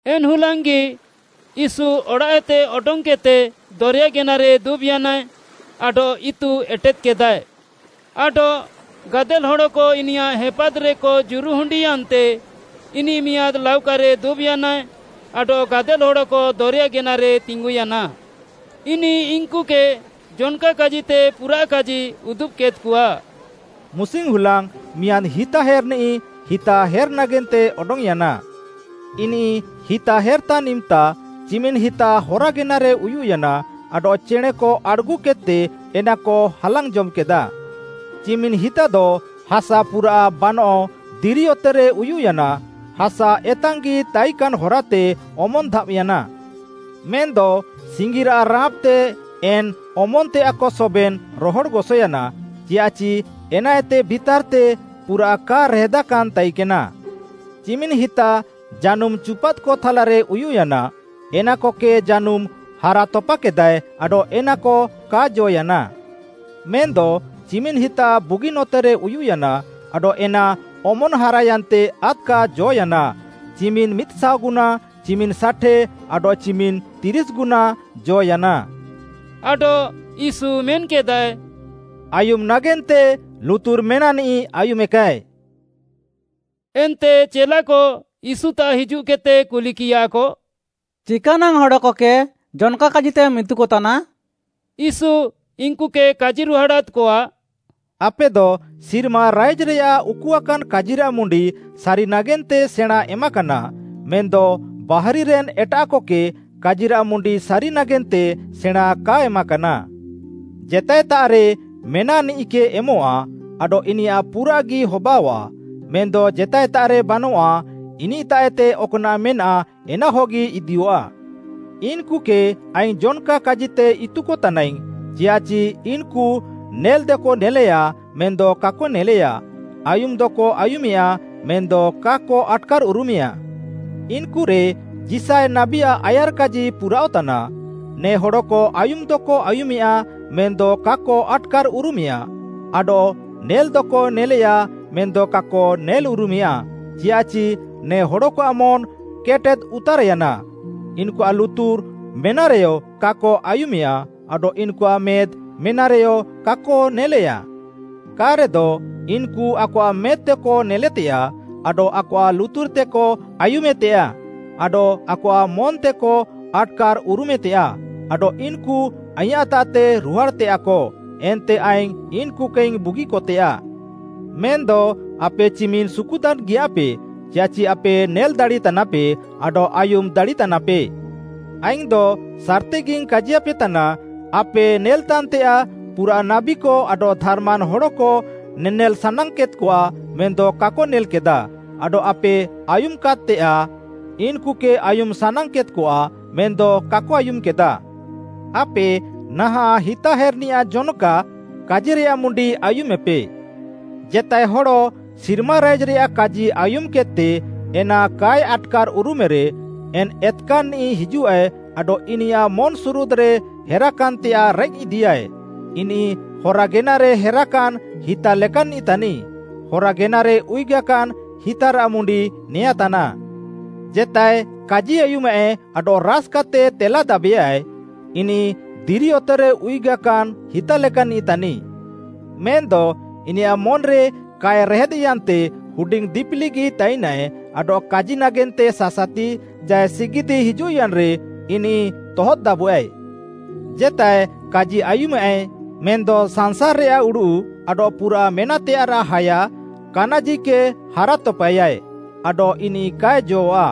ଏନ୍‌ ହୁଲାଙ୍ଗ୍‌ଗି ୟୀଶୁ ଅଡ଼ାଃଏତେ ଅଡଙ୍ଗ୍‌କେଦ୍‌ତେ ଦରେୟା ଗେନାରେ ଦୁବ୍‌ୟାନାଏ, ଆଡଃ ଇତୁ ଏଟେଦ୍‌କେଦାଏ। ଆଡଃ ଗାଦେଲ୍‌ ହଡ଼କ ଇନିୟାଃ ହେପାଦ୍‌ରେକ ଜୁରୁହୁଣ୍ଡିୟାନ୍ତେ ଇନିଃ ମିଆଁଦ୍‌ ଲାଉକାରେ ଦୁବ୍‌ୟାନାଏ ଆଡଃ ଗାଦେଲ୍‌ ହଡ଼କ ଦରେୟା ଗେନାରେ ତିଙ୍ଗୁୟାନା। ଇନିଃ ଇନ୍‌କୁକେ ଜନ୍‌କା କାଜିତେ ପୁରାଃ କାଜି ଉଦୁବ୍‌କେଦ୍‌କଆ। “ମୁସିଙ୍ଗ୍‌ହୁଲାଙ୍ଗ୍‌ ମିଆଁଦ୍‌ ହିତାହେର୍‌ନିଃ ହିତା ହେର୍‌ ନାଗେନ୍ତେ ଅଡଙ୍ଗ୍‌ୟାନା। ଇନିଃ ହିତା ହେର୍‌ତାନ୍‌ ଇମ୍‌ତା, ଚିମିନ୍‌ ହିତା ହରା ଗେନାରେ ଉୟୁଃୟାନା ଆଡଃ ଚେଣେଁକ ଆଡ଼୍‌ଗୁକେଦ୍‌ତେ ଏନାକ ହାଲାଙ୍ଗ୍‌ ଜମ୍‌କେଦା। ଚିମିନ୍‌ ହିତାଦ ହାସା ପୁରାଃ ବାନଃ ଦିରି ଅତେରେ ଉୟୁଃୟାନା, ହାସା ଏତାଙ୍ଗ୍‌ଗି ତାଇକାନ୍‌ ହରାତେ ଅମନ୍‌ ଧାବ୍‌ୟାନା। ମେନ୍‌ଦ ସିଙ୍ଗିରାଃ ରାଁପ୍‌ତେ ଏନ୍‌ ଅମନ୍‌ତେୟାଃକ ସବେନ୍‌ ରହଡ଼୍‌ଗସୟାନା, ଚିୟାଃଚି ଏନାଏତେ ଭିତାର୍‌ତେ ପୁରାଃ କା ରେହେଦାକାନ୍‌ ତାଇକେନା। ଚିମିନ୍‌ ହିତା ଜାନୁମ୍‌ ଚୁପାଦ୍‌କ ଥାଲାରେ ଉୟୁଃୟାନା, ଏନାକକେ ଜାନୁମ୍‌ ହାରାତପାକେଦାଏ, ଆଡଃ ଏନାକ କା ଜ ୟାନା। ମେନ୍‌ଦ ଚିମିନ୍‌ ହିତା ବୁଗିନ୍‌ ଅତେରେ ଉୟୁଃୟାନା, ଆଡଃ ଏନା ଅମନ୍‌ ହାରାୟାନ୍ତେ ଆଦ୍‌କା ଜ'ୟାନା, ଚିମିନ୍‌ ମିଦ୍‌ଶାଅଗୁନା, ଚିମିନ୍‌ ଷାଠେ, ଆଡଃ ଚିମିନ୍‌ ତିରିଶ୍‌ଗୁନା, ଜ'ୟାନା।” ଆଡଃ ୟୀଶୁ ମେନ୍‌କେଦାଏ, “ଆୟୁମ୍‌ ନାଗେନ୍ତେ ଲୁତୁର୍ ମେନାଃନିଃ ଆୟୁମେକାଏ।” ଏନ୍ତେ ଚେଲାକ ୟୀଶୁତାଃ ହିଜୁଃକେଦ୍‌ତେ କୁଲିକିୟାକ, “ଚିକାନାଙ୍ଗ୍‌ ହଡ଼କକେ ଜନ୍‌କା କାଜିତେମ୍‌ ଇତୁକତାନା?” ୟୀଶୁ ଇନ୍‌କୁକେ କାଜିରୁହାଡ଼ାଦ୍‌କଆ, “ଆପେଦ ସିର୍ମା ରାଇଜ୍‌ରେୟାଃ ଉକୁଆକାନ୍‌ କାଜିରାଃ ମୁଣ୍ଡି ସାରି ନାଗେନ୍ତେ ସେଣାଁଁ ଏମାକାନା, ମେନ୍‌ଦ ବାହାରିରେନ୍‌ ଏଟାଃକକେ କାଜିରାଃ ମୁଣ୍ଡି ସାରି ନାଗେନ୍ତେ ସେଣାଁଁ କା ଏମାକାନା। ଜେତାଏତାଃରେ ମେନାଃନିଃକେ ଏମଃଆ, ଆଡଃ ଇନିୟାଃ ପୁରାଃଗି ହବାଅଆଃ, ମେନ୍‌ଦ ଜେତାଏତାଃରେ ବାନଃଆ, ଇନିଃତାଃଏତେ ଅକ୍‌ନାଃ ମେନାଃ ଏନାହଗି ଇଦିୟଃଆ। ଇନ୍‌କୁକେ ଆଇଙ୍ଗ୍‌ ଜନ୍‌କା କାଜିତେ ଇତୁକ ତାନାଇଙ୍ଗ୍‌, ଚିୟାଃଚି ଇନ୍‌କୁ ନେଲ୍‌ଦକ ନେଲେୟା ମେନ୍‌ଦ କାକ ନେଲେୟା, ଆୟୁମ୍‌ଦକ ଆୟୁମେୟା ମେନ୍‌ଦ କାକ ଆଟ୍‌କାର୍‌ଉରୁମେୟାଁ। ଇନ୍‌କୁରେ ଯିଶାୟ ନାବୀଆଃ ଆୟାର୍‌କାଜି ପୁରାଅଃତାନା, “‘ନେ ହଡ଼କ ଆୟୁମ୍‌ଦକ ଆୟୁମେୟା ମେନ୍‌ଦ କାକ ଆଟ୍‌କାର୍‌ଉରୁମେୟାଁ; ଆଡଃ ନେଲ୍‌ଦକ ନେଲେୟା ମେନ୍‌ଦ କାକ ନେଲ୍‌ଉରୁମେୟାଁ, ଚିୟାଃଚି ନେ ହଡ଼କଆଃ ମନ୍‌ କେଟେଦ୍‌ଉତାର୍‌ୟାନା, ଇନ୍‌କୁଆଃ ଲୁତୁର୍‌ ମେନାଃରେୟ କାକ ଆୟୁମେୟା ଆଡଃ ଇନ୍‌କୁଆଃ ମେଦ୍‌ ମେନାଃରେୟ କାକ ନେଲେୟା। କା'ରେଦ, ଇନ୍‌କୁ ଆକଆଃ ମେଦ୍‌ତେକ ନେଲେତେୟାଃ, ଆଡଃ ଆକଆଃ ଲୁତୁର୍‌ତେକ ଆୟୁମେତେୟାଃ, ଆଡଃ ଆକଆଃ ମନ୍‌ତେକ ଆଟ୍‌କାର୍‌ଉରୁମେତେୟାଃ, ଆଡଃ ଇନ୍‌କୁ ଆଇଁୟାଃତାଃତେ ରୁହାଡ଼୍‌ତେୟାଃକ, ଏନ୍ତେ ଆଇଙ୍ଗ୍‌ ଇନ୍‌କୁକେଇଙ୍ଗ୍‌ ବୁଗିକତେୟାଃ।’” “ମେନ୍‌ଦ ଆପେ ଚିମିନ୍‌ ସୁକୁତାନ୍‌ଗିୟାଃପେ, ଚିୟାଃଚି ଆପେ ନେଲ୍‌ ଦାଡ଼ିତାନାପେ, ଆଡଃ ଆୟୁମ୍‌ ଦାଡ଼ିତାନାପେ। ଆଇଙ୍ଗ୍‌ଦ ସାର୍‌ତିଗିଙ୍ଗ୍‌ କାଜିୟାପେତାନା, ଆପେ ନେଲ୍‌ତାନ୍‌ତେୟାଃ ପୁରାଃ ନାବୀକ ଆଡଃ ଧାର୍‌ମାନ୍‌ ହଡ଼କ ନେନେଲ୍‌ ସାନାଙ୍ଗ୍‌କେଦ୍‌କଆ ମେନ୍‌ଦ କାକ ନେଲ୍‌କେଦା ଆଡଃ ଆପେ ଆୟୁମ୍‌କେଦ୍‌ତେୟାଃ ଇନ୍‌କୁକେ ଆୟୁମ୍‌ ସାନାଙ୍ଗ୍‌କେଦ୍‌କଆ ମେନ୍‌ଦ କାକ ଆୟୁମ୍‌କେଦା। “ଆପେ ନାହାଁଃ ହିତାହେର୍‌ନିଆଃ ଜନ୍‌କା କାଜିରେୟାଃ ମୁଣ୍ଡି ଆୟୁମେପେ। ଜେତାଏ ହଡ଼ ସିର୍ମା ରାଇଜ୍‌ରେୟାଃ କାଜି ଆୟୁମ୍‌କେଦ୍‌ତେ ଏନା କାଏ ଆଟ୍‌କାର୍‍ଉରୁମେରେ, ଏନ୍‌ ଏତ୍‌କାନ୍‌ନିଃ ହିଜୁଃଆଏ ଆଡଃ ଇନିୟାଃ ମନ୍‌ସୁରୁଦ୍‌ରେ ହେରାକାନ୍‌ତେୟାଃ ରେଃକ୍‌ ଇଦିୟାଏ, ଇନିଃ ହରା ଗେନାରେ ହେରାକାନ୍‌ ହିତା ଲେକାନ୍‌ନିଃ ତାନିଃ। ହରା ଗେନାରେ ଉୟୁଗାକାନ୍‌ ହିତାରାଃ ମୁଣ୍ଡି ନେଆଁଁ ତାନାଃ। ଜେତାଏ କାଜି ଆୟୁମାଃଏ ଆଡଃ ରାସ୍‌କାତେ ତେଲାଦାବେଆ, ଇନିଃ ଦିରି ଅତେରେ ଉୟୁଗାକାନ୍‌ ହିତା ଲେକାନ୍‌ନିଃ ତାନିଃ। ମେନ୍‌ଦ ଇନିୟାଃ ମନ୍‌ରେ କାଏ ରେହେଦ୍‌ୟାନ୍‌ତେ ହୁଡିଙ୍ଗ୍‌ ଦିପିଲିଗି ତାଇନାଏ ଆଡଃ କାଜି ନାଗେନ୍ତେ ସାସାତି ଚାଏ ସିଗିଦ୍‌ ହିଜୁଃୟାନ୍‌ରେ ଇନିଃ ତହଦ୍‍ଦାବଃଆଏ। ଜେତାଏ କାଜି ଆୟୁମାଃଏ ମେନ୍‌ଦ ସାଂସାର୍‌ରେୟାଃ ଉଡ଼ୁଃ ଆଡଃ ପୁରାଃ ମେନାଃତେୟାଃରାଃ ହାୟା, କାନାଜିକେ ହାରାତପାଏୟା ଆଡଃ ଇନିଃ କାଏ ଜଅଃ'ଆ,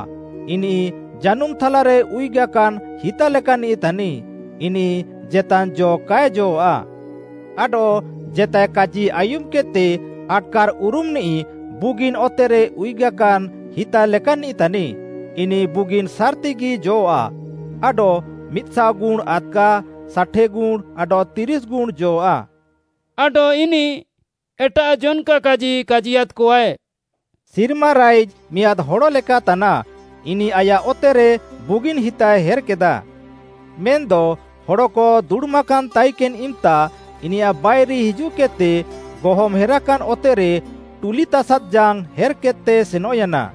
ଇନିଃ ଜାନୁମ୍‌ ଥାଲାରେ ଉୟୁଗାକାନ୍‌ ହିତା ଲେକାନ୍‌ନିଃ ତାନିଃ, ଇନିଃ ଜେତାନ୍‌ ଜ କାଏ ଜଅଃ'ଆ। ଆଡଃ ଜେତାଏ କାଜି ଆୟୁମ୍‌କେଦ୍‌ତେ ଆଟ୍‌କାର୍‍ଉରୁମ୍‌ନିଃ ବୁଗିନ୍‌ ଅତେରେ ଉୟୁଗାକାନ୍‌ ହିତା ଲେକାନ୍‌ନିଃ ତାନିଃ, ଇନିଃ ବୁଗିନ୍‌ ସାର୍‌ତିଗି ଜଅଃ'ଆ ଆଡଃ ମିଦ୍‌ଶାଅ ଗୁଣ୍‌ ଆଦ୍‌କା, ଷାଠେ ଗୁଣ୍‌ ଆଡଃ ତିରିଶ୍‌ ଗୁଣ୍‌ ଜଅଃ'ଆ।” ଆଡଃ ଇନିଃ ଏଟାଃ ଜନ୍‌କା କାଜି କାଜିୟାଦ୍‍କଆଏ, “ସିର୍ମା ରାଇଜ୍‌ ମିଆଁଦ୍‌ ହଡ଼ ଲେକା ତାନାଃ, ଇନିଃ ଆୟାଃ ଅତେରେ ବୁଗିନ୍‌ ହିତାଏ ହେର୍‌କେଦା। ମେନ୍‌ଦ ହଡ଼କ ଦୁଡ଼ୁମାକାନ୍‌ ତାଇକେନ୍‌ ଇମ୍‌ତା ଇନିୟାଃ ବାଇରି ହିଜୁଃକେଦ୍‌ତେ ଗହମ୍‌ ହେରାକାନ୍‌ ଅତେରେ ଟୁଲିତାସାଦ୍‌ ଜାଙ୍ଗ୍‌ ହେର୍‌କେଦ୍‌ତେ ସେନଃୟାନା।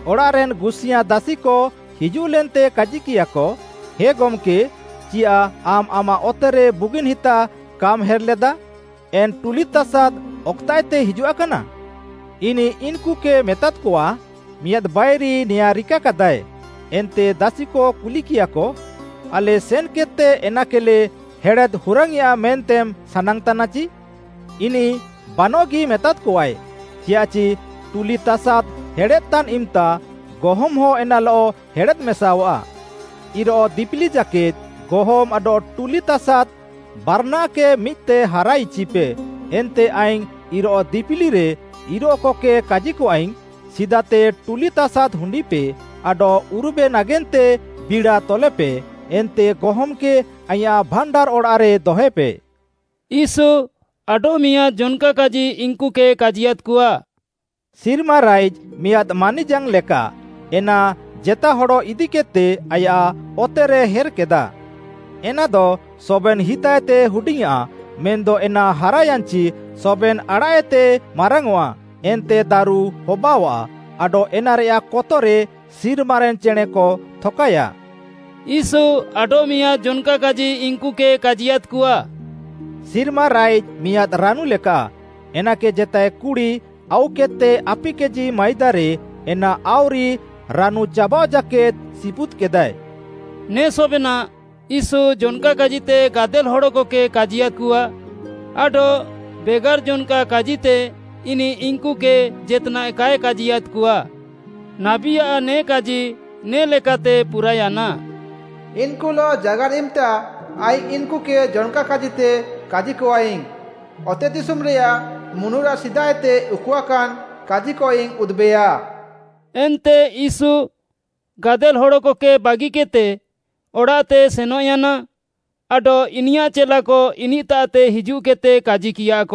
ଅଡ଼ାଃରେନ୍‌ ଗୁସିୟାଁ ଦାସିକ ହିଜୁଃଲେନ୍ତେ କାଜିକିୟାକ, ‘ହେ ଗମ୍‌କେ, ଚିୟାଃ ଆମ୍‌ ଆମାଃ ଅତେରେ ବୁଗିନ୍‌ ହିତା କାମ୍‌ ହେର୍‌ଲେଦା, ଏନ୍‌ ଟୁଲିତାସାଦ୍‌ ଅକ୍‌ତାଃଏତେ ହିଜୁଆକାନା?’ ଇନିଃ ଇନ୍‌କୁକେ ମେତାଦ୍‌କଆ, ‘ମିଆଁଦ୍‌ ବାଇରି ନେଆଁଁ ରିକାକାଦାଏ।’ ଏନ୍ତେ ଦାସିକ କୁଲିକିୟାକ, ‘ଆଲେ ସେନ୍‌କେଦ୍‌ତେ ଏନାକେଲେ ହେଡ଼େଦ୍ ହୁରାଙ୍ଗ୍‌ୟେଁଆ ମେନ୍ତେମ୍‌ ସାନାଙ୍ଗ୍‌ତାନାଚି?’ ଇନିଃ ‘ବାନଃଗି’ ମେତାଦ୍‌କଆଏ, ‘ଚିୟାଃଚି ଟୁଲିତାସାଦ୍‌ ହେଡ଼େଦ୍‍ତାନ୍‌ ଇମ୍‌ତା ଗହମ୍‌ହଁ ଏନାଲଃ ହେଡ଼େଦ୍‌ମେସାଅଃଆ। ଇରୋଃ ଦିପିଲି ଜାକେଦ୍‌ ଗହମ୍‌ ଆଡଃ ଟୁଲିତାସାଦ୍‌ ବାର୍‌ନାଃକେ ମିଦ୍‌ତେ ହାରାଇଚିପେ ଏନ୍ତେ ଆଇଙ୍ଗ୍‌ ଇରୋଃ ଦିପିଲିରେ ଇରୋଃକକେ କାଜିକଆଇଙ୍ଗ୍‌, ସିଦାତେ ଟୁଲିତାସାଦ୍‌ ହୁଣ୍ଡିପେ ଆଡଃ ଉରୁବେ ନାଗେନ୍ତେ ବିଡ଼ା ତଲେପେ ଏନ୍ତେ ଗହମ୍‌କେ ଆଇଁୟାଃ ଭାଣ୍ଡାର୍‌ ଅଡ଼ାଃରେ ଦହଏପେ।’” ୟୀଶୁ ଆଡଃମିଆଁଦ୍‌ ଜନ୍‌କା କାଜି ଇନ୍‌କୁକେ କାଜିୟାଦ୍‍କଆ, “ସିର୍ମା ରାଇଜ୍‌ ମିଆଁଦ୍‌ ମାନିଜାଙ୍ଗ୍‌ ଲେକା ଏନା ଜେତା ହଡ଼ ଇଦିକେଦ୍‌ତେ ଆୟାଃ ଅତେରେ ହେର୍‌କେଦା। ଏନାଦ ସବେନ୍‌ ହିତାଏତେ ହୁଡିଙ୍ଗ୍‌ଆଁ ମେନ୍‌ଦ ଏନା ହାରାୟାନ୍‍ଚି ସବେନ୍‌ ଆଡ଼ାଃଏତେ ମାରାଙ୍ଗ୍‌ଅଃଆ ଏନ୍ତେ ଦାରୁ ହବାଅଆଃ, ଆଡଃ ଏନାରେୟାଃ କତରେ ସିର୍ମାରେନ୍‌ ଚେଣେଁକ ଥକାୟା।” ୟୀଶୁ ଆଡଃମିଆଁଦ୍‌ ଜନ୍‌କା କାଜି ଇନ୍‌କୁକେ କାଜିୟାଦ୍‍କଆ, “ସିର୍ମା ରାଇଜ୍‌ ମିଆଁଦ୍‌ ରାନୁ ଲେକାଃ, ଏନାକେ ଜେତାଏ କୁଡ଼ି ଆଉକେଦ୍‌ତେ ଆପି କେଜି ମାଇଦାରେ ଏନା ଆଉରି ରାନୁଚାବାଅଃ ଜାକେଦ୍‌ ସିପୁଦ୍‌କେଦାଏ।” ନେ ସବେନାଃ, ୟୀଶୁ ଜନ୍‌କା କାଜିତେ ଗାଦେଲ୍‌ ହଡ଼କକେ କାଜିୟାଦ୍‍କଆ ଆଡଃ ବେଗାର୍‌ ଜନ୍‌କା କାଜିତେ ଇନିଃ ଇନ୍‌କୁକେ ଜେତ୍‌ନାଃ କାଏ କାଜିୟାଦ୍‍କଆ। ନାବୀଆଃ ନେ କାଜି ନେ ଲେକାତେ ପୁରାୟାନା, “ଇନ୍‌କୁଲଃ ଜାଗାର୍‌ ଇମ୍‌ତା ଆଇଙ୍ଗ୍‌ ଇନ୍‌କୁକେ ଜନ୍‌କା କାଜିତେ କାଜିକଆଇଙ୍ଗ୍‌; ଅତେଦିଶୁମ୍‌ରେୟାଃ ମୁନୁରାଃ ସିଦାଏତେ ଉକୁଆକାନ୍‌ କାଜିକଇଙ୍ଗ୍‌ ଉଦୁବେୟା।” ଏନ୍ତେ ୟୀଶୁ ଗାଦେଲ୍‌ ହଡ଼କକେ ବାଗିକେଦ୍‌ତେ ଅଡ଼ାଃତେ ସେନଃୟାନା ଆଡଃ ଇନିୟାଃ ଚେଲାକ ଇନିଃତାଃତେ ହିଜୁଃକେଦ୍‌ତେ କାଜିକିୟାକ,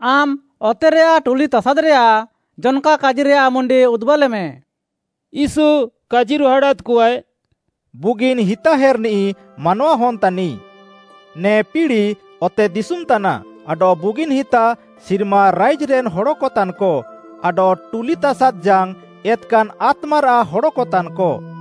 “ଆମ୍‌ ଅତେରେୟାଃ ଟୁଲିତାସାଦ୍‌ରେୟାଃ ଜନ୍‌କା କାଜିରେୟାଃ ମୁଣ୍ଡି ଉଦୁବାଲେମେ।” ୟୀଶୁ କାଜିରୁହାଡ଼ାଦ୍‍କଆଏ, “ବୁଗିନ୍‌ ହିତା ହେର୍‌ନିଃ ମାନୱାହନ୍‌ ତାନିଃ। ନେ ପିଡ଼ି, ଅତେଦିଶୁମ୍‌ ତାନାଃ ଆଡଃ ବୁଗିନ୍‌ ହିତା, ସିର୍ମା ରାଇଜ୍‌ରେନ୍‌ ହଡ଼କ ତାନ୍‌କ ଆଡଃ ଟୁଲିତାସାଦ୍‌ ଜାଙ୍ଗ୍‌, ଏତ୍‌କାନ୍‌ ଆତ୍ମାରାଃ ହଡ଼କ ତାନ୍‌କ।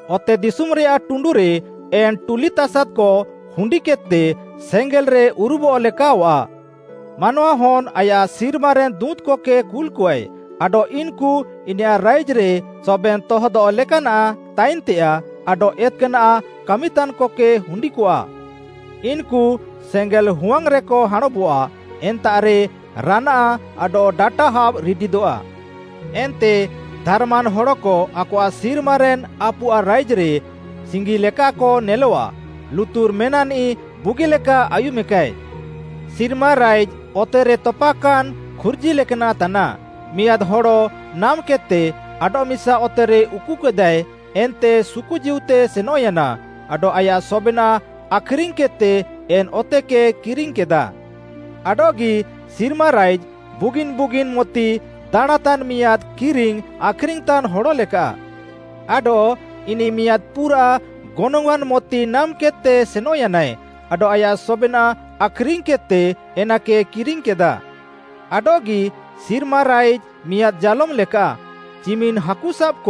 ଅତେଦିଶୁମ୍‌ରେୟାଃ ଟୁଣ୍ଡୁରେ ଏନ୍‌ ଟୁଲିତାସାଦ୍‌କ ହୁଣ୍ଡିକେଦ୍‌ତେ ସେଙ୍ଗେଲ୍‌ରେ ଉରୁବଃ ଲେକାଅଃଆ। ମାନୱାହନ୍‌ ଆୟାଃ ସିର୍ମାରେନ୍‌ ଦୁଁତ୍‌କକେ କୁଲ୍‌କଆଏ ଆଡଃ ଇନ୍‌କୁ ଇନିୟାଃ ରାଇଜ୍‌ରେ ସବେନ୍‌ ତହଦଃ ଲେକାନାଃ ତାଇନ୍‌ତେୟାଃ ଆଡଃ ଏତ୍‌କାନାଃ କାମିତାନ୍‌କକେ ହୁଣ୍ଡିକଆ। ଇନ୍‌କୁ ସେଙ୍ଗେଲ୍‌ ହୁୱାଙ୍ଗ୍‌ରେକ ହାଁଣବଆଃ, ଏନ୍ତାଃରେ ରାନାଆଃ ଆଡଃ ଡାଟା ହାବ୍‌ ରିଡିଦଃଆ। ଏନ୍ତେ ଧାର୍‌ମାନ୍‌ ହଡ଼କ ଆକଆଃ ସିର୍ମାରେନ୍‌ ଆପୁଆଃ ରାଇଜ୍‌ରେ ସିଙ୍ଗିଲେକାକ ନେଲଆଃ। ଲୁତୁର୍‌ ମେନାଃନିଃ ବୁଗିଲେକା ଆୟୁମେକାଏ। “ସିର୍ମା ରାଇଜ୍‌ ଅତେରେ ତପାକାନ୍‌ ଖୁର୍ଜି ଲେକାନାଃ ତାନାଃ, ମିଆଁଦ୍‌ ହଡ଼ ନାମ୍‌କେଦ୍‌ତେ ଆଡଃମିସା ଅତେରେ ଉକୁକେଦାଏ ଏନ୍ତେ ସୁକୁଜୀଉତେ ସେନଃୟାନା ଆଡଃ ଆୟାଃ ସବେନାଃ ଆଖ୍‌ରିଙ୍ଗ୍‌କେଦ୍‌ତେ ଏନ୍‌ ଅତେକେ କିରିଙ୍ଗ୍‌କେଦା। “ଆଡଃଗି ସିର୍ମା ରାଇଜ୍‌ ବୁଗିନ୍‌ ବୁଗିନ୍‌ ମୋତି ଦାଣାଁଁତାନ୍‌ ମିଆଁଦ୍‌ କିରିଙ୍ଗ୍‌ ଆଖ୍‌ରିଙ୍ଗ୍‌ତାନ୍‌ ହଡ଼ଲେକାଃ। ଆଡଃ ଇନିଃ ମିଆଁଦ୍‌ ପୁରାଃ ଗନଙ୍ଗ୍‌ଆଁନ୍‌ ମୋତି ନାମ୍‌କେଦ୍‌ତେ ସେନଃୟାନାଏ ଆଡଃ ଆୟାଃ ସବେନାଃ ଆଖ୍‌ରିଙ୍ଗ୍‌କେଦ୍‌ତେ ଏନାକେ କିରିଙ୍ଗ୍‌କେଦା। “ଆଡଃଗି ସିର୍ମା ରାଇଜ୍‌ ମିଆଁଦ୍‌ ଜାଲୋମ୍‌ ଲେକାଃ, ଚିମିନ୍‌ ହାକୁସାବ୍‌କ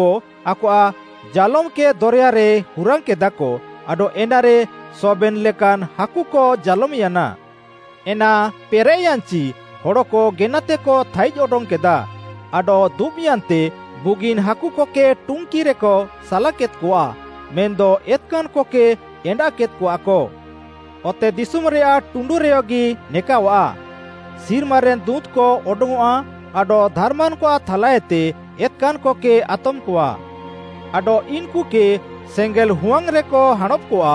ଆକଆଃ ଜାଲୋମ୍‌କେ ଦରେୟାରେ ହୁରାଙ୍ଗ୍‌କେଦାକ ଆଡଃ ଏନାରେ ସବେନ୍‌ ଲେକାନ୍‌ ହାକୁକ ଜାଲୋମ୍‌ୟାନା। ଏନା ପେରେଃୟାନ୍‌ଚି ହଡ଼କ ଗେନାତେକ ଥାଇଜ୍‌ ଅଡଙ୍ଗ୍‌କେଦା ଆଡଃ ଦୁବ୍‌ୟାନ୍ତେ ବୁଗିନ୍‌ ହାକୁକକେ ଟୁଙ୍କିରେକ ସାଲାକେଦ୍‌କଆ ମେନ୍‌ଦ ଏତ୍‍କାନ୍‌କକେ ଏଣ୍ଡାଃକେଦ୍‍କଆକ। ଅତେଦିଶୁମ୍‌ରେୟାଃ ଟୁଣ୍ଡୁରେୟଗି ନେକାଅଃଆ। ସିର୍ମାରେନ୍‌ ଦୁଁତ୍‌କ ଅଡଙ୍ଗ୍‌ଅଃଆ ଆଡଃ ଧାର୍‌ମାନ୍‌କଆଃ ଥାଲାଏତେ ଏତ୍‍କାନ୍‌କକେ ଆତମ୍‌କଆ। ଆଡଃ ଇନ୍‌କୁକେ ସେଙ୍ଗେଲ୍‌ ହୁୱାଙ୍ଗ୍‌ରେକ ହାଁଣବ୍‌କଆ,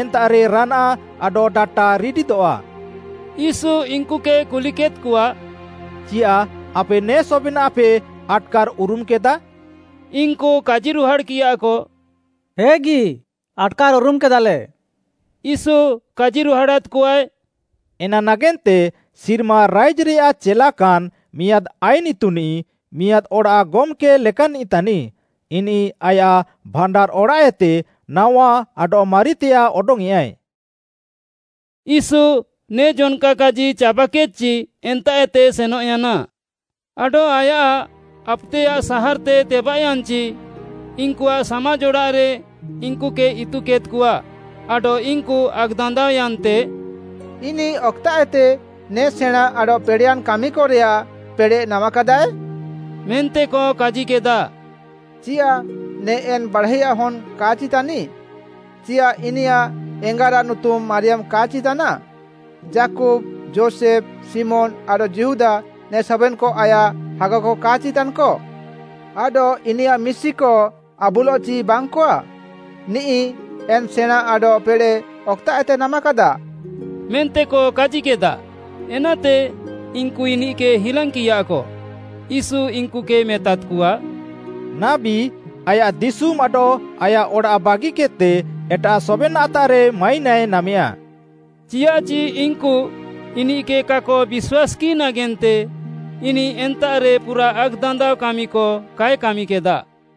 ଏନ୍ତାଃରେ ରାନାଆଃ ଆଡଃ ଡାଟା ରିଡିଦଃଆ। “ୟୀଶୁ ଇନ୍‌କୁକେ କୁଲିକେଦ୍‌କଆ, ଚିୟାଃ ଆପେ ନେ ସବେନାଃପେ ଆଟ୍‌କାର୍‌ଉରୁମ୍‌କେଦା?” ଇନ୍‌କୁ କାଜିରୁହାଡ଼୍‌କିୟାକ, “ହେଗି, ଆଟ୍‌କାର୍‍ଉରୁମ୍‌କେଦାଲେ।” ୟୀଶୁ କାଜିରୁହାଡ଼ାଦ୍‌କଆଏ, “ଏନା ନାଗେନ୍ତେ ସିର୍ମା ରାଇଜ୍‌ରେୟାଃ ଚେଲାକାନ୍‌ ମିଆଁଦ୍‌ ଆଇନ୍‌ ଇତୁନିଃ, ମିଆଁଦ୍‌ ଅଡ଼ାଃ ଗମ୍‌କେ ଲେକାନ୍‌ନିଃ ତାନିଃ। ଇନିଃ ଆୟାଃ ଭାଣ୍ଡାର୍‌ଅଡ଼ାଃଏତେ ନାୱା ଆଡଃ ମାରିତେୟାଃ ଅଡଙ୍ଗ୍‌ୟେଁଆଏ।” ୟୀଶୁ ନେ ଜନ୍‌କା କାଜି ଚାବାକେଦ୍‍ଚି ଏନ୍ତାଃଏତେ ସେନଃୟାନା। ଆଡଃ ଆୟାଃ ଆପୁତେୟାଃ ସାହାର୍‌ତେ ତେବାଃୟାନ୍‌ଚି ଇନ୍‌କୁଆଃ ସାମାଜ୍‌ ଅଡ଼ାଃରେ ଇନ୍‌କୁକେ ଇତୁକେଦ୍‍କଆ ଆଡଃ ଇନ୍‌କୁ ଆକ୍‌ଦାନ୍ଦାଅୟାନ୍ତେ, “ଇନିଃ ଅକ୍‌ତାଃଏତେ ନେ ସେଣାଁଁ ଆଡଃ ପେଡ଼େୟାନ୍‌ କାମିକରେୟାଃ ପେଡ଼େଃ ନାମାକାଦାଏ?” ମେନ୍ତେକ କାଜିକେଦା। “ଚିୟାଃ ନିଃ ଏନ୍‌ ବାଢ଼ାଇଆଃ ହନ୍‌ କା'ଚି ତାନିଃ? ଚିୟାଃ ଇନିୟାଃ ଏଙ୍ଗାରାଃ ନୁତୁମ୍‌ ମାରିୟାମ୍‌ କା'ଚି ତାନାଃ? ଯାକୁବ୍‌, ଯୋଷେଫ୍‌, ଶିମୋନ୍‌ ଆଡଃ ଯିହୁଦା ନେ ସବେନ୍‌କ ଆୟାଃ ହାଗାକ କା'ଚି ତାନ୍‌କ? ଆଡଃ ଇନିୟାଃ ମିଶିକ ଆବୁଲଃଚି ବାଙ୍ଗ୍‌କଆ? ନିଃ ଏନ୍‌ ସେଣାଁଁ ଆଡଃ ପେଡ଼େଃ ଅକ୍‌ତାଃଏତେ ନାମାକାଦା?” ମେନ୍ତେକ କାଜିକେଦା। ଏନାତେ ଇନ୍‌କୁ ଇନିଃକେ ହିଲାଙ୍ଗ୍‌କିୟାକ। ୟୀଶୁ ଇନ୍‌କୁକେ ମେତାଦ୍‌କଆ, “ନାବୀ ଆୟାଃ ଦିଶୁମ୍‌ ଆଡଃ ଆୟାଃ ଅଡ଼ାଃ ବାଗିକେଦ୍‌ତେ ଏଟାଃ ସବେନ୍‌ତାଃରେ ମାଇନାଏ ନାମେୟା।” ଚିୟାଃଚି ଇନ୍‌କୁ ଇନିଃକେ କାକ ବିଶ୍ୱାସ୍‌କିଃ ନାଗେନ୍ତେ ଇନିଃ ଏନ୍ତାଃରେ ପୁରାଃ ଆକ୍‌ଦାନ୍ଦାଅ କାମିକ କାଏ କାମିକେଦା।